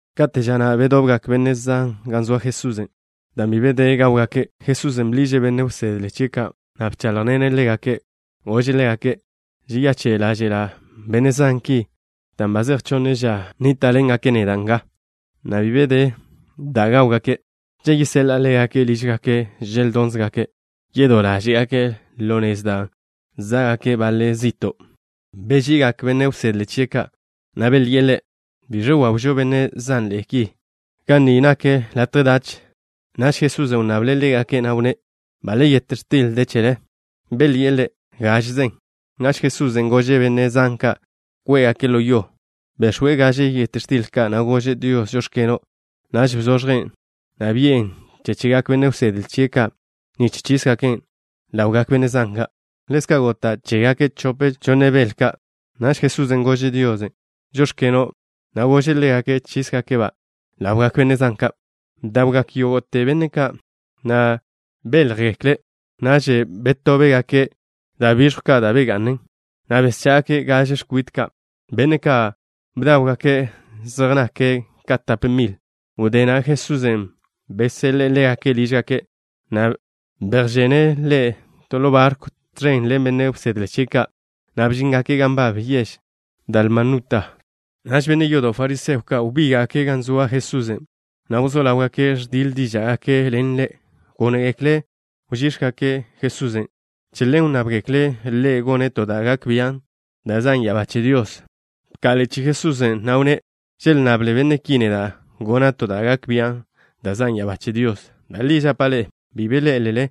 Kate' ža na' bedobgak benne' zan gan zoa Jesusen'. Dan' bi be de da' gáwgake', Jesusen' bḻiže' benne' wsedle chie' ka', na' bcháḻjḻene' ḻégake'. Gože' ḻégake': —Žeyache' ḻáže'la' benne' zan ki dan' ba zej chonne ža nníta'ḻengake' neda' nga, na' bi be de da' gáwgake'. Cha' yeseḻa'a ḻégake' lížgake' želdonze' ka', yedó ḻáže'gake' ḻo nez, dan' za'gak baḻe' zi'to'. Beži'igak benne' wsedle chie' ka', na' belyi'e Ḻe': —¿Biẕ wawžo benne' zanḻe'e ki ga ni nak latje dach? Naž Jesusen' wnnable' ḻégake', na' wnné': —¿Baḻ yet x̱til de chele? Belyi'e Ḻe': —Gážeze. Naž Jesusen' gože' benne' zan ka' kwé'gake' ḻo yo. Bex̱we' gaže yet x̱til ka', na' gože' Dios: “Žóx̱keno'”. Naž bzoẕjen', na' bi'en chegak benne' wsedle chie' ka' nich chísgaken' ḻawgak benne' zan ka'. Ḻezka' gota' chégake' chope chonne bel ka'. Naž Jesusen' gože' Dios: “Žóx̱keno'” na' gože' ḻégake' chísgake'-ba' ḻawgak benne' zan ka'. Bdawgak yógo'te benne' ka', na' béljegekle'. Naž betóbgake' da' bižjw ka' da' begá'ngaken, na' beschá'gake' gaže x̱kwite ka'. Benne' ka' bdáwgake' zej nyángake' ka tape mile'. Wdé na' Jesusen' beseḻe'e ḻégake' lížgake', na' bejžene' ḻo barkw tẕen ḻen benne' wsedle chie' ka', na' bžíngake' gan nbab yež Dalmanuta. Naž benne' yodo' fariseo ka' wbíga'gake' gan zoa Jesusen', na' wzó ḻáwgake' ẕdiḻ díža'gake' ḻen Ḻe'. Gónegekle' wžíx̱gake' Jesusen'. Che ḻen wnnábgekle' Ḻe' gone' to da' gak bian' da' zan' ya'abá che Dios. Bka'ḻe'e chi'i Jesusen', na' wnné': —Želnnable benne' ki neda' gona' to da' gak bian' da' zan' ya'abá che Dios. Da' li žapa' ḻe'e, bi ḻé'elele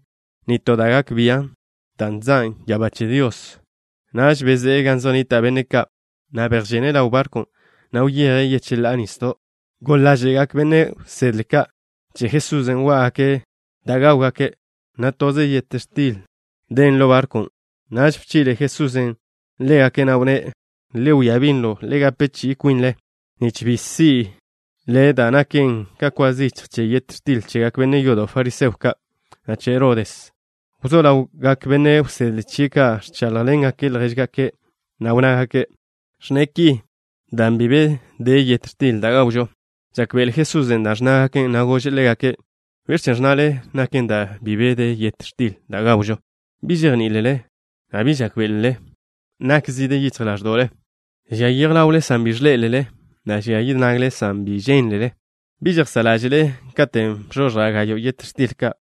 nitó da' gak bian' da' zan' ya'abá che Dios. Naž bezé'e gan zej nnita' benne' ka', na' bejžene' ḻaw barkw, na' wyeje' yecheḻá'a nisdo'. Goḻ ḻáže'gak benne' wsedle ka' che Jesusen' wá'gake' da' gáwgake', na' toze yet x̱til den ḻo barkwn'. Naž bchi'le Jesusen' ḻégake', na' wnné': —Le wia binlo. Le gape chi'i kwinle nich bi si'le da' naken ka kwa zichj che yet x̱til chegak benne' yodo' fariseo ka', na' che Herodes. Wzó ḻawgak benne' wsedle chie' ka' ẕcháḻjḻengake' ljéžgake' ka', na' wnnágake': —Ẕnne' ki dan' bi de yet x̱til da' gawžo. Žákbe'ele Jesusen' dan' ẕnnágake', na' gože' ḻégake': —¿Biẕ chen' ẕnnale naken dan' bi de yet x̱til da' gawžo? ¿Bi žejní'ilele, na' bi žákbe'elele? ¿Nak zide yichj ḻáẕdo'le? ¿Žia yej ḻawle san bi ẕḻé'elele, na' žia yid nagle san bi žénlele? ¿Bi žejsá' ḻáže'le? Katen' bzoẕja' gayo' yet x̱til ka',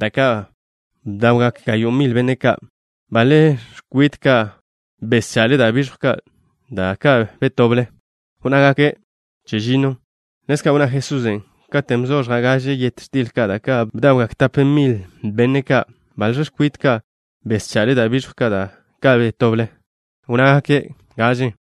da' ka' bdawgak gayo' mil benne' ka', ¿baḻ x̱kwite ka' bescha'le da' bižjw ka', da' ka' betoble? Wnnágake': —Chežinno. Ḻezka' wnná Jesusen': —Katen' bzoẕja' gaže yet x̱til ka', da' ka' bdawgak tape mil benne' ka', ¿baḻ x̱kwite ka' bescha'le da' bižjw ka', da' ka' betoble? Wnnágake': —Gaže.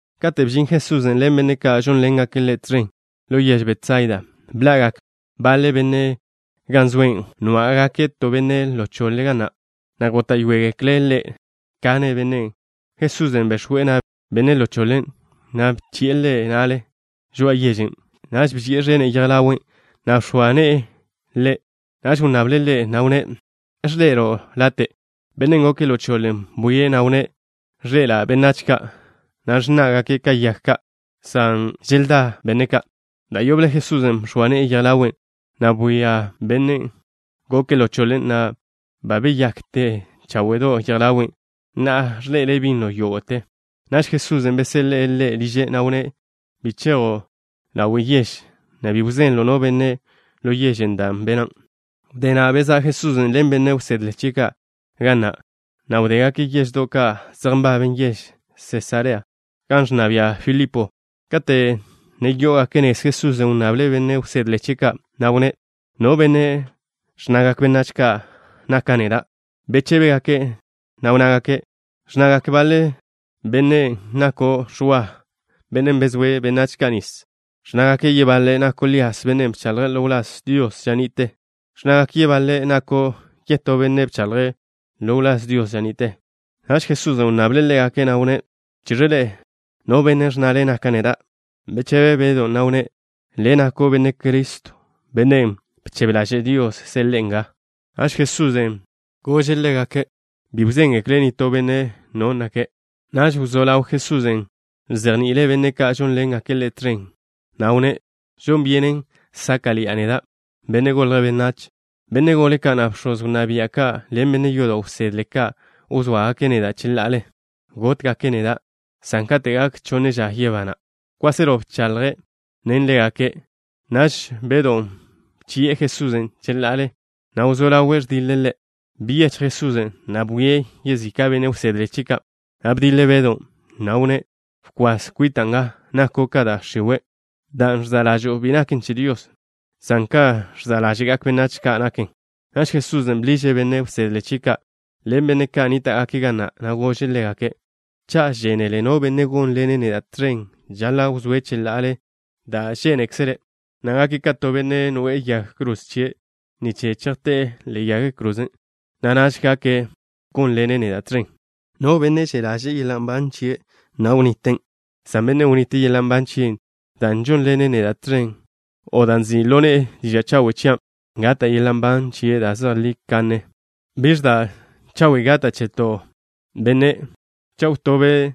Kate' bžin Jesusen' ḻen benne' ka' žónḻengake' Ḻe' tẕen ḻo yež Betsaida, bḻa'gak baḻe benne' gan zoe', nwá'gake' to benne' ḻo choḻe ga na', na' góta'yoegekle' Ḻe' kane' bennen'. Jesusen' bex̱we' na' benne' ḻo choḻen', na' bchi'e ḻe' na'le žoa'a yežen'. Naž bžie' ẕene' yej ḻawe', na' bx̱oa ne'e ḻe'. Naž wnnable' ḻe', na' wnné': —¿Ẕḻe'elo' late'? Bennen' goke' ḻo choḻe bwie', na' wnné': —Ẕḻe'ela' benách ka', na' ẕnná'gake' ka yag ka', san želdá benne' ka'. Da' yoble Jesusen' bx̱oa ne'e yej ḻawe', na' bwia bennen' goke' ḻo choḻe, na' ba beyakte cháwe'do' yej ḻawe'. Na'a ẕḻe'ele' binlo yógo'te. Naž Jesusen' beseḻe'e ḻe' liže', na' wnné': —Bi chejo' ḻawe' yež, na' bi wzenlo' no benne' ḻo yežen' dan' bena'. Wdé na' bezá' Jesusen' ḻen benne' wsedle chie' ka' ga na', na' wdégake' yeždo' ka' zej nbaben yež Sesarea, gan ẕnna bia' Filipo. Kate' ne yó'ogake' nez, Jesusen' wnnable' benne' wsedle chie' ka', na' wnné': —¿No benne' ẕnnagak benách ka' naka' neda'? Bechébegake', na' wnnágake': —Ẕnnagak baḻe benne' nako' Ẕwa, bennen' bezóe' benách ka' nis. Ẕnnágake' yebaḻe' nako' Lías, bennen' bchaḻje' ḻo wláz Dios ža ni'te. Ẕnnágake' yebaḻe' nako' yetó benne' bchaḻje' ḻo wláz Dios ža ni'te. Naž Jesusen' wnnable' ḻégake', na' wnné': —¿Chiẕe ḻe'e, no benne' ẕnnale naka' neda'? Bechebe Bedw, na' wnné': —Le' nako' Benne' Criston', bennen' bchebe ḻaže' Dios seḻe'e nga. Naž Jesusen' bchi'le ḻégake' bi wzéngekle' nitó benne' no nake'. Naž wzó ḻaw Jesusen' ẕzejni'ile' benne' ka' žónḻengake' Ḻe' tẕen, na' wnné': —Žon byenen sáka'ḻi'a neda', Benne' Golje' Benách. Benne' gole ka', na' bx̱oz wnná bia' ka' ḻen benne' yodo' wsedle ka' wzóagake' neda' cheḻa'ale. Gótgake' neda', san kate' gak chonne ža yebana'. Kwáselo bcháḻjḻene' ḻégake'. Naž Bedw bchi'e Jesusen' cheḻa'ale, na' wzó ḻawe' ẕdiḻe' Ḻe'. Byechj Jesusen', na' bwie' yezika' benne' wsedle chie' ka', na' bdiḻe' Bedon', na' wnné': —Bkwas kwita' nga. Nako' ka da' x̱iwe'. Da' ẕza' ḻažo'o bi naken che Dios, san kan ẕza' ḻáže'gak benách ka' naken. Naž Jesusen' bḻiže' benne' wsedle chie' ka' ḻen benne' ka' nníta'gake' ga na', na' gože' ḻégake': —Cha' žénele no benne' gónḻene' neda' tẕen, žaḻa' wzóe' cheḻa'ale da' žénekzele', na' gake' ka to benne' noe'e yag kroze chie' nich chejté'e ḻe'e yag krozen', na' naž gak gónḻene' neda' tẕen. No benne' že' ḻaže'e yeḻa' nban chie', wniten', san bennen' wnite' yeḻa' nban chie' dan' žónḻene' neda' tẕen, o dan' nzi' ḻo ne'e diža' chawe' chian', gata' yeḻa' nban da' zejlí kanne chie'. ¿Biẕ da' chawe' gata' che to benne' cha' wtobe'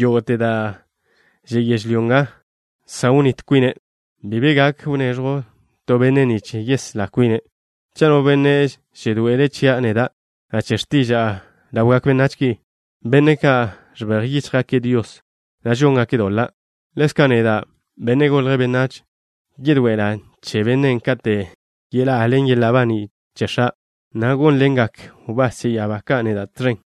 yógo'te da' že' yežlyó nga, san wnít kwine'? Bi be gak wneẕjw to benne' nich yeslá kwine'. Cha' no benne' žedoe'ele' chia' neda', na' che x̱tiža'a ḻawgak benách ki, benne' ka' ẕbej yíchjgake' Dios, na' žóngake' doḻa', ḻezka' neda', Benne' Golje' Benách, yedoe'ela' che bennen' kate' yeḻá'a ḻen yeḻa' baní' che X̱a', na' gónḻengak wbás che ya'abá ka' neda' tẕen.